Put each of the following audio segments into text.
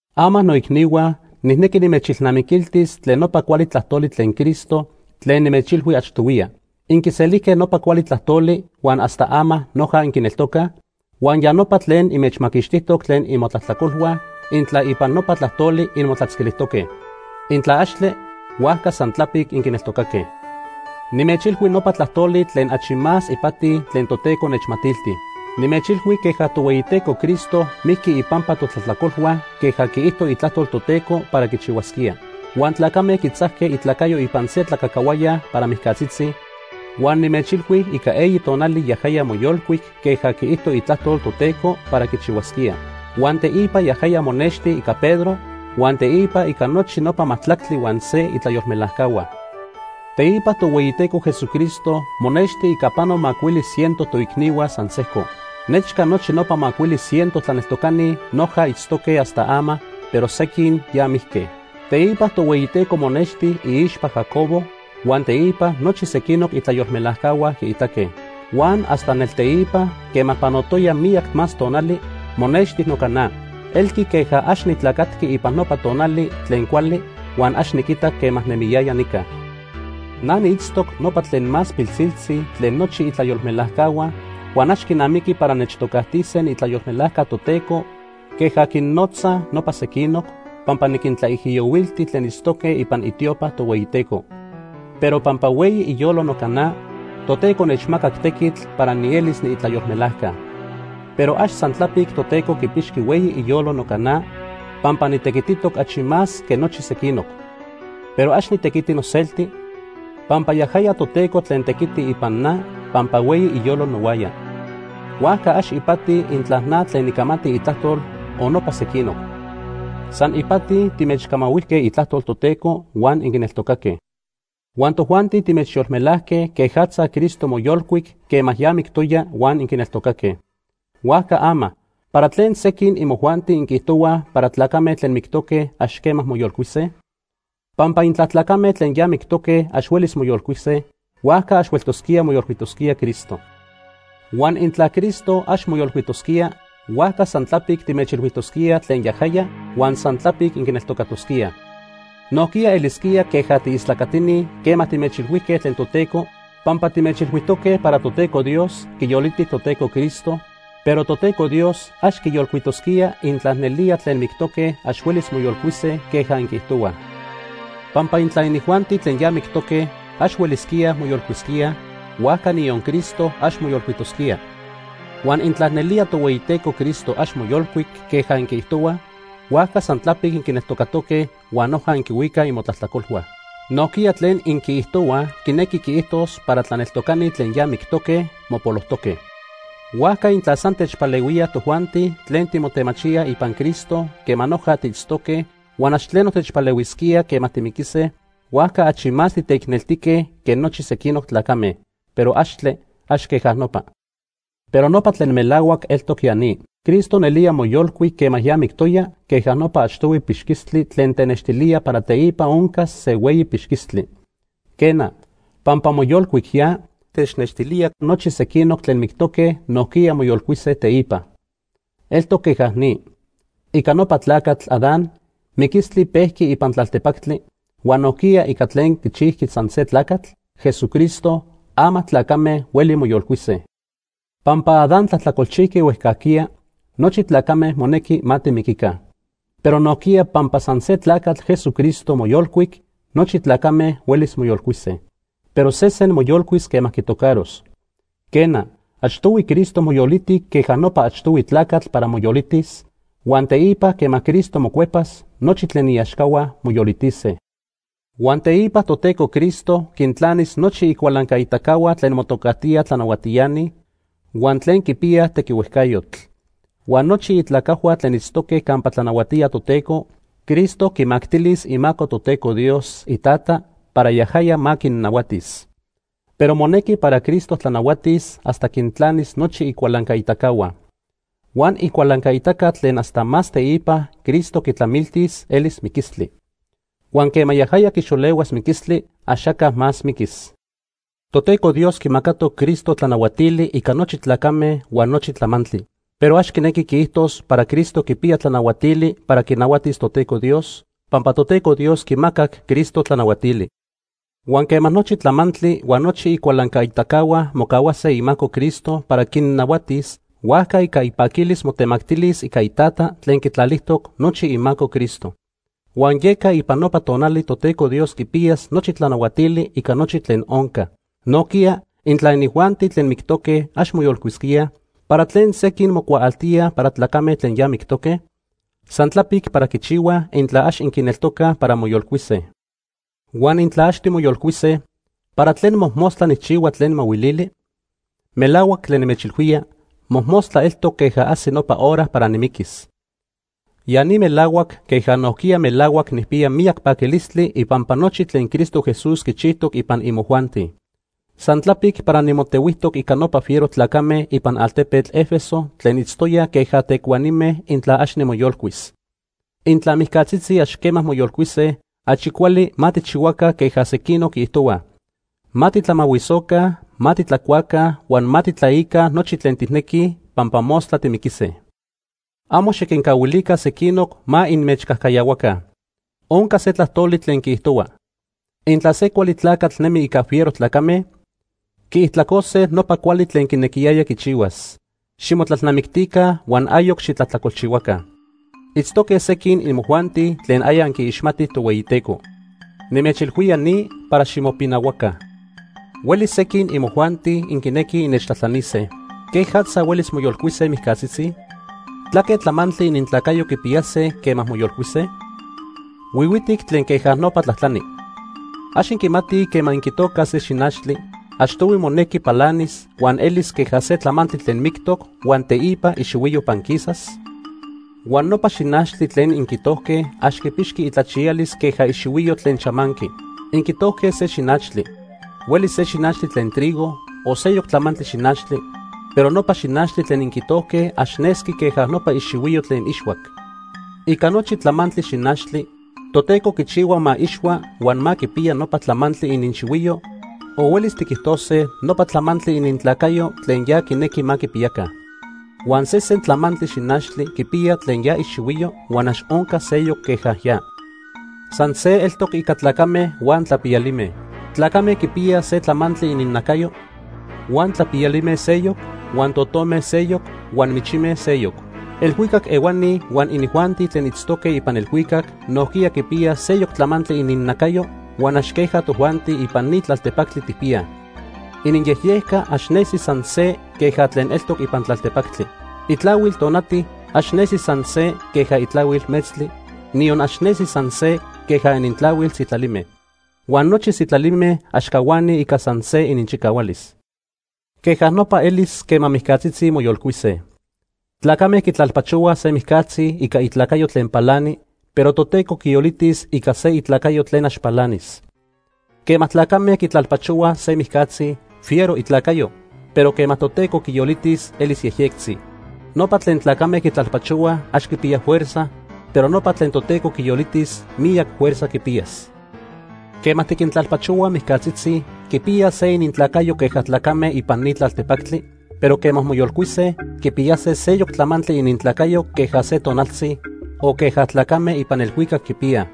Ama noicnihua, nijnequi nimechilnamiquiltis tlen nopa cuali tlajtoli tlen Cristo tlen nimechilhui achtohuiya. Inquiselijque nopa cuali tlajtoli huan hasta ama noja inquineltocaj, huan ya nopa tlen inmechmaquixtijtoc tlen imotlajtlacolhua intla ipan nopa tlajtoli inmotlatzquilijtoque. Intla axtle, huajca san tlapic inquineltocaque. Nimechilhui nopa tlajtoli tlen achi más ipati tlen Toteco nechmatilti. Nimechilhui queja Tohueyiteco Cristo mijqui ipampa totlajtlacolhua queja quiijto Itlajtol Toteco para quichihuasquía. Huan tlacame quitzajque itlacayo ipan se tlacajcahuaya para mijcatzitzi, huan nimechilhui ica eyi tonali yajaya moyolcuic queja quiijto Itlajtol Toteco para quichihuasquía. Huan teipa yajaya monexti ica Pedro huan teipa ica nochi nopa majtlactli huan se itlayolmelajcahua. Teipa Tohueyiteco Jesucristo monexti ica pano macuili ciento toicnihua san sejco. Nechca nochi nopa macuili ciento tlaneltocani noja itztoque hasta ama, pero sequin ya mijque. Teipa Tohueyiteco monexti iixpa Jacobo, huan teipa nochi sequinoc itlayolmelajcahua quiitaque. Huan hasta nelteipa, quema panotoya miyac más tonali, monexti noca na. Elqui queja ax nitlacatqui ipan nopa tonali tlen cuali huan ax niquitac quema nemiyaya nica. Na niitztoc nopa tlen más pilsiltzi tlen nochi itlayolmelajcahua huan ax quinamiqui para nechtocajtise niitlayolmelajca Toteco queja quinnotzaj nopa sequinoc, pampa niquintlaijiyohuilti tlen itztoque ipan itiopa Tohueyiteco. Pero pampa hueyi iyolo noca na, Toteco nechmacac tequitl para nielis niitlayolmelajca. Pero ax san tlapic Toteco quipixqui hueyi iyolo noca na, pampa nitequititoc achi más que nochi sequinoc. Pero ax nitequiti noselti, pampa yajaya Toteco tlen tequiti ipan na pampa hueyi iyolo nohuaya. Huajca ax ipati intla na tlen nicamati itlajtol o nopa sequinoc. San ipati timechcamahuijque itlajtol Toteco huan inquineltocaque. Huan tojuanti timechyolmelajque quejatza Cristo moyolcuic quema ya mictoya huan inquineltocaque. Huajca ama ¿para tlen sequin imojuanti inquiijtohuaj para tlacame tlen mictoque ax quema moyolcuise? Pampa intla tlacame tlen ya mictoque ax huelis moyolcuise, huajca ax hueltosquía moyolcuitosquía Cristo. Huan intla Cristo ax moyolcuitosquía, huajca san tlapic timechilhuijtosquíaj tlen yajaya huan san tlapic inquineltocatosquíaj. Nojquiya elisquía queja tiistlacatini quema timechilhuijque tlen Toteco, pampa timechilhuijtoque para Toteco Dios quiyoliti Toteco Cristo, pero Toteco Dios ax quiyolcuitosquía intla nelía tlen mictoque ax huelis moyolcuise queja inquiijtohuaj. Pampa intla inijuanti tlen ya mictoque ax huelisquíaj moyolcuisquíaj, huajca niyon Cristo ax moyolcuitosquía. Huan intla nelía Tohueyiteco Cristo ax moyolcuic queja inquiijtohuaj, huajca san tlapic inquineltocatoque huan noja inquihuicaj imotlajtlacolhua. Nojquiya tlen inquiijtohuaj quinequi quiijtos para tlaneltocani tlen ya mictoque, mopolojtoque. Huajca intla san techpalehuía tojuanti tlen timotemachíaj ipan Cristo quema noja tiitztoque huan ax tleno techpalehuisquía quema timiquise, huajca achi más titeicneltique que nochi sequinoc tlacame. Pero axtle, ax queja nopa. Pero nopa tlen melahuac eltoc ya ni. Cristo nelía moyolcuic quema ya mictoya queja nopa achtohui pixquistli tlen tenextilía para teipa oncas se hueyi pixquistli. Quena, pampa moyolcuic ya, technextilía nochi sequinoc tlen mictoque nojquiya moyolcuise teipa. Eltoc queja ni. Ica nopa tlacatl, Adán, miquistli pejqui ipan tlaltepactli, huan nojquiya ica tlen quichijqui san se tlacatl, Jesucristo, ama tlacame hueli moyolcuise. Pampa Adán tlajtlacolchijqui huejcajquiya, nochi tlacame monequi ma timiquica. Pero nojquiya pampa san se tlacatl, Jesucristo, moyolcuic, nochi tlacame huelis moyolcuise. Pero sesen moyolcuis quema quitocaros. Quena, achtohui Cristo moyoliti queja nopa achtohui tlacatl para moyolitis, huan teipa quema Cristo mocuepas, nochi tlen iaxcahua moyolitise. Huan teipa Toteco Cristo quintlanis nochi icualancaitacahua tlen motocajtíaj tlanahuatiani, huan tlen quipiyaj tequihuejcayotl. Huan nochi itlacajhua tlen itztoque campa tlanahuatía Toteco, Cristo quimactilis imaco Toteco Dios, iTata, para yajaya ma quinnahuatis. Pero monequi para Cristo tlanahuatis hasta quintlanis nochi icualancaitacahua. Huan icualancaitaca tlen hasta más teipa Cristo quitlamiltis elis miquistli. Huan quema yajaya quixolehuas miquilistli, axaca más miquis. Toteco Dios quimacatoc Cristo tlanahuatili ica nochi tlacame huan nochi tlamantli. Pero ax quinequi quiijtos para Cristo quipiya tlanahuatili para quinahuatis Toteco Dios, pampa Toteco Dios quimacac Cristo tlanahuatili. Huan quema nochi tlamantli huan nochi icualancaitacahua mocahuase imaco Cristo para quinnahuatis, huajca ica ipaquilis motemactilis ica iTata tlen quitlalijtoc nochi imaco Cristo. Huan yeca ipan nopa tonali Toteco Dios quipiyas nochi tlanahuatili ica nochi tlen onca. Nojquiya, intla inijuanti tlen mictoque ax moyolcuisquíaj, ¿para tlen sequin mocuaaltíaj para tlacame tlen ya mictoque? San tlapic para quichihuaj intla ax inquineltocaj para moyolcuise. Huan intla ax timoyolcuise, ¿para tlen mojmostla nijchihua tlen mahuilili? Melahuac tlen nimechilhuía, mojmostla eltoc queja ajsi nopa hora para nimiquis. Ya ni melahuac queja nojquiya melahuac nijpiya miyac paquilistli ipampa nochi tlen Cristo Jesús quichijtoc ipan imojuanti. San tlapic para nimotehuijtoc ica nopa fiero tlacame ipan altepetl Éfeso tlen itztoyaj queja tecuanime intla ax nimoyolcuis. Intla mijcatzitzi ax quema moyolcuise, achi cuali ma tijchihuaca queja sequinoc quiijtohuaj: “Ma titlamahuisoca, ma titlacuaca huan ma titlaica nochi tlen tijnequij, pampa mostla timiquise.” Amo xiquincahuilica sequinoc ma inmechcajcayahuaca. Onca se tlajtoli tlen quiijtohua: “Intla se cuali tlacatl nemi ica fiero tlacame, quiijtlacose nopa cuali tlen quinequiyaya quichihuas.” Ximotlalnamictica huan ayoc xitlajtlacolchihuaca. Itztoque sequin imojuanti tlen aya inquiixmatij Tohueyiteco. Nimechilhuía ni para ximopinahuaca. Huelis sequin imojuanti inquinequij innechtlajtlanise: “¿Quejatza huelis moyolcuise mijcatzitzi? ¿Tlaque tlamantli inintlacayo quipiyase quema moyolcuise?” Huihuitic tlen queja nopa tlajtlani. ¿Ax inquimatij quema inquitocaj se xinachtli, achtohui monequi palanis huan elis queja se tlamantli tlen mictoc huan teipa ixihuiyo panquisas? Huan nopa xinachtli tlen inquitojque ax quipixqui itlachiyalis queja ixihuiyo tlen chamanqui. Inquitojque se xinachtli. Huelis se xinachtli tlen trigo o seyoc tlamantli xinachtli, pero nopa xinachtli tlen inquitojque ax nesqui queja nopa ixihuiyo tlen ixhuac. Ica nochi tlamantli xinachtli Toteco quichihua ma ixhua huan ma quipiya nopa tlamantli ininxihuiyo o huelis tiquijtose nopa tlamantli inintlacayo tlen ya quinequi ma quipiyaca. Huan sesen tlamantli xinachtli quipiya tlen ya ixihuiyo huan ax onca seyoc queja ya. San se eltoc ica tlacame huan tlapiyalime. Tlacame quipiyaj se tlamantli ininnacayo, huan tlapiyalime seyoc, huan totome seyoc, huan michime seyoc. Elhuicac ehuani huan inijuanti tlen itztoque ipan elhuicac nojquiya quipiyaj seyoc tlamantli ininnacayo huan ax queja tojuanti ipan ni tlaltepactli tijpiyaj. Iniyejyejca ax nesi san se queja tlen eltoc ipan tlaltepactli. Itlahuil tonati ax nesi san se queja itlahuil metztli, niyon ax nesi san se queja inintlahuil sitlalime. Huan nochi sitlalime ax cahuanij ica san se ininchicahualis. Queja nopa elis quema mijcatzitzi moyolcuise. Tlacame quitlalpachohuaj se mijcatzi ica itlacayo tlen palani, pero Toteco quiyolitis ica se itlacayo tlen ax palanis. Quema tlacame quitlalpachohuaj se mijcatzi, fiero itlacayo, pero quema Toteco quiyolitis, elis yejyectzi. Nopa tlen tlacame quitlalpachohuaj ax quipiya fuerza, pero nopa tlen Toteco quiyolitis miyac fuerza quipiyas. Quema tiquintlalpachohuaj mijcatzitzi, quipiyaj se inintlacayo queja tlacame ipan ni tlaltepactli, pero quema moyolcuise, quipiyase seyoc tlamantli inintlacayo queja se tonaltzi, o queja tlacame ipan elhuicac quipiyaj.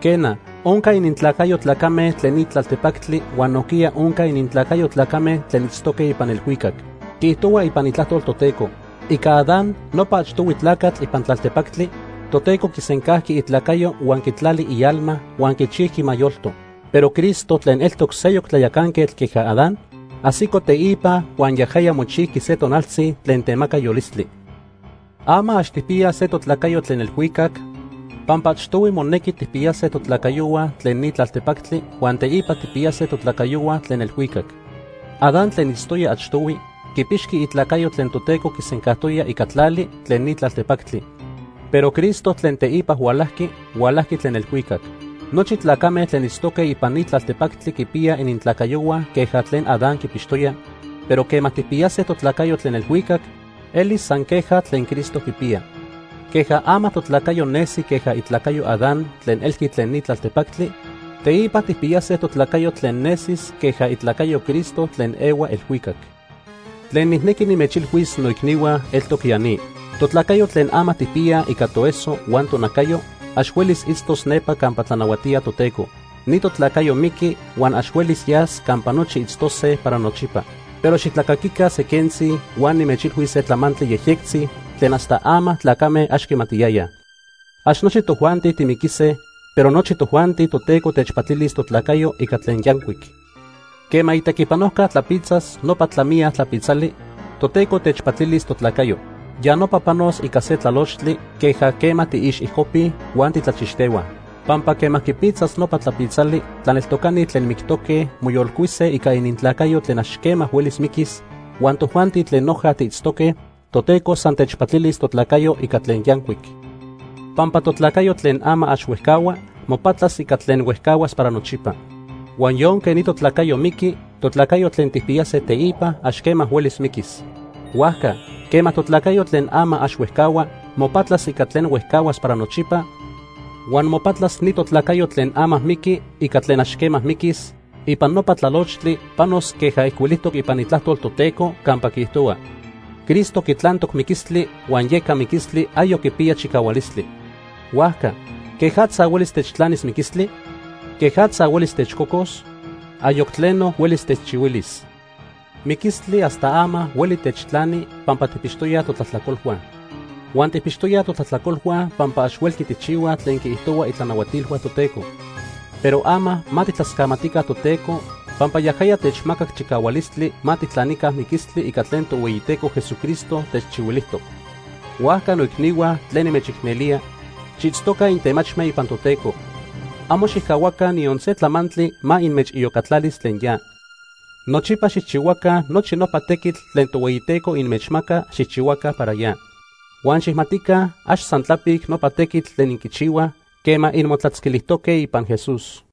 Quena, onca inintlacayo tlacame tlen ni tlaltepactli huan nojquiya onca inintlacayo tlacame tlen itztoque ipan elhuicac. Quiijtohua ipan Itlajtol Toteco: “Ica Adán, nopa achtohui tlacatl ipan tlaltepactli, Toteco quisencajqui itlacayo huan quitlali ialma huan quichijqui ma yolto.” Pero Cristo, tlen eltoc seyoc tlayacanquetl queja Adán, ajsico teipa huan yajaya mochijqui se tonaltzi tlen temaca yolistli. Ama, ax tijpiyaj se totlacayo tlen elhuicac, pampa achtohui monequi tijpiyase totlacayohua tlen ni tlaltepactli huan teipa tijpiyase totlacayohua tlen elhuicac. Adán tlen itztoya achtohui, quipixqui itlacayo tlen Toteco quisencajtoya ica tlali tlen ni tlaltepactli. Pero Cristo tlen teipa hualajqui, hualajqui tlen elhuicac. Nochi tlacame tlen itztoque ipan ni tlaltepactli quipiyaj inintlacayohua queja tlen Adán quipixtoya, pero quema tijpiyase totlacayo tlen elhuicac, elis san queja tlen Cristo quipiya. Queja ama totlacayo nesi queja itlacayo Adán tlen elqui tlen ni tlaltepactli, teipa tijpiyase totlacayo tlen nesis queja itlacayo Cristo tlen ehua elhuicac. Tlen nijnequi nimechilhuis, noicnihua, eltoc ya ni. Totlacayo tlen ama tijpiyaj ica toeso huan tonacayo, ax huelis itztos nepa campa tlanahuatía Toteco. Ni totlacayo miqui huan ax huelis yas campa nochi itztose para nochipa. Pero xitlacaquica se quentzi huan nimechilhuis se tlamantli yejyectzi tlen hasta ama tlacame ax quimatiyayaj. Ax nochi tojuanti timiquise, pero nochi tojuanti Toteco techpatilis totlacayo ica tlen yancuic. Quema itequipanojca tlapitzas nopa tlamiya tlapitzali, Toteco techpatilis totlacayo. Ya nopa panos ica se tlalochtli queja quema tiixijcopij huan titlachixtehuaj. Pampa quema quipitzas nopa tlapitzali, tlaneltocani tlen mictoque, moyolcuise ica inintlacayo tlen ax quema huelis miquis, huan tojuanti tlen noja tiitztoque, Toteco san techpatilis totlacayo ica tlen yancuic. Pampa totlacayo tlen ama ax huejcahua, mopatlas ica tlen huejcahuas para nochipa, huan yonque ni totlacayo miqui, totlacayo tlen tijpiyase teipa, ax quema huelis miquis. Huajca, quema totlacayo tlen ama ax huejcahua, mopatlas ica tlen huejcahuas para nochipa, huan mopatlas ni totlacayo tlen ama miqui ica tlen ax quema miquis, ipan nopa tlalochtli panos queja ijcuilijtoc ipan Itlajtol Toteco campa quiijtohua: “Cristo quitlantoc miquistli huan yeca miquistli ayoc quipiya chicahualistli. Huajca ¿quejatza huelis techtlanis miquistli? ¿Quejatza huelis techcocos? Ayoc tleno huelis techchihuilis.” Miquilistli hasta ama hueli techtlani pampa tijpixtoyaj totlajtlacolhua. Huan tijpixtoyaj totlajtlacolhua pampa ax huelqui tijchihuaj tlen quiijtohua itlanahuatilhua Toteco. Pero ama ma tijtlascamatica Toteco pampa yajaya techmacac chicahualistli ma tijtlanica miquistli ica tlen Tohueyiteco Jesucristo techchihuilijtoc. Huajca, noicnihua, tlen nimechicnelía, xiitztoca intemachme ipan Toteco. Amo xijcahuaca niyon se tlamantli ma inmechiyocatlalis tlen ya. Nochipa xijchihuaca nochi nopa tequitl tlen Tohueyiteco inmechmaca xijchihuaca para ya. Huan xijmatica, ax san tlapic nopa tequitl tlen inquichihuaj quema inmotlatzquilijtoque ipan Jesús.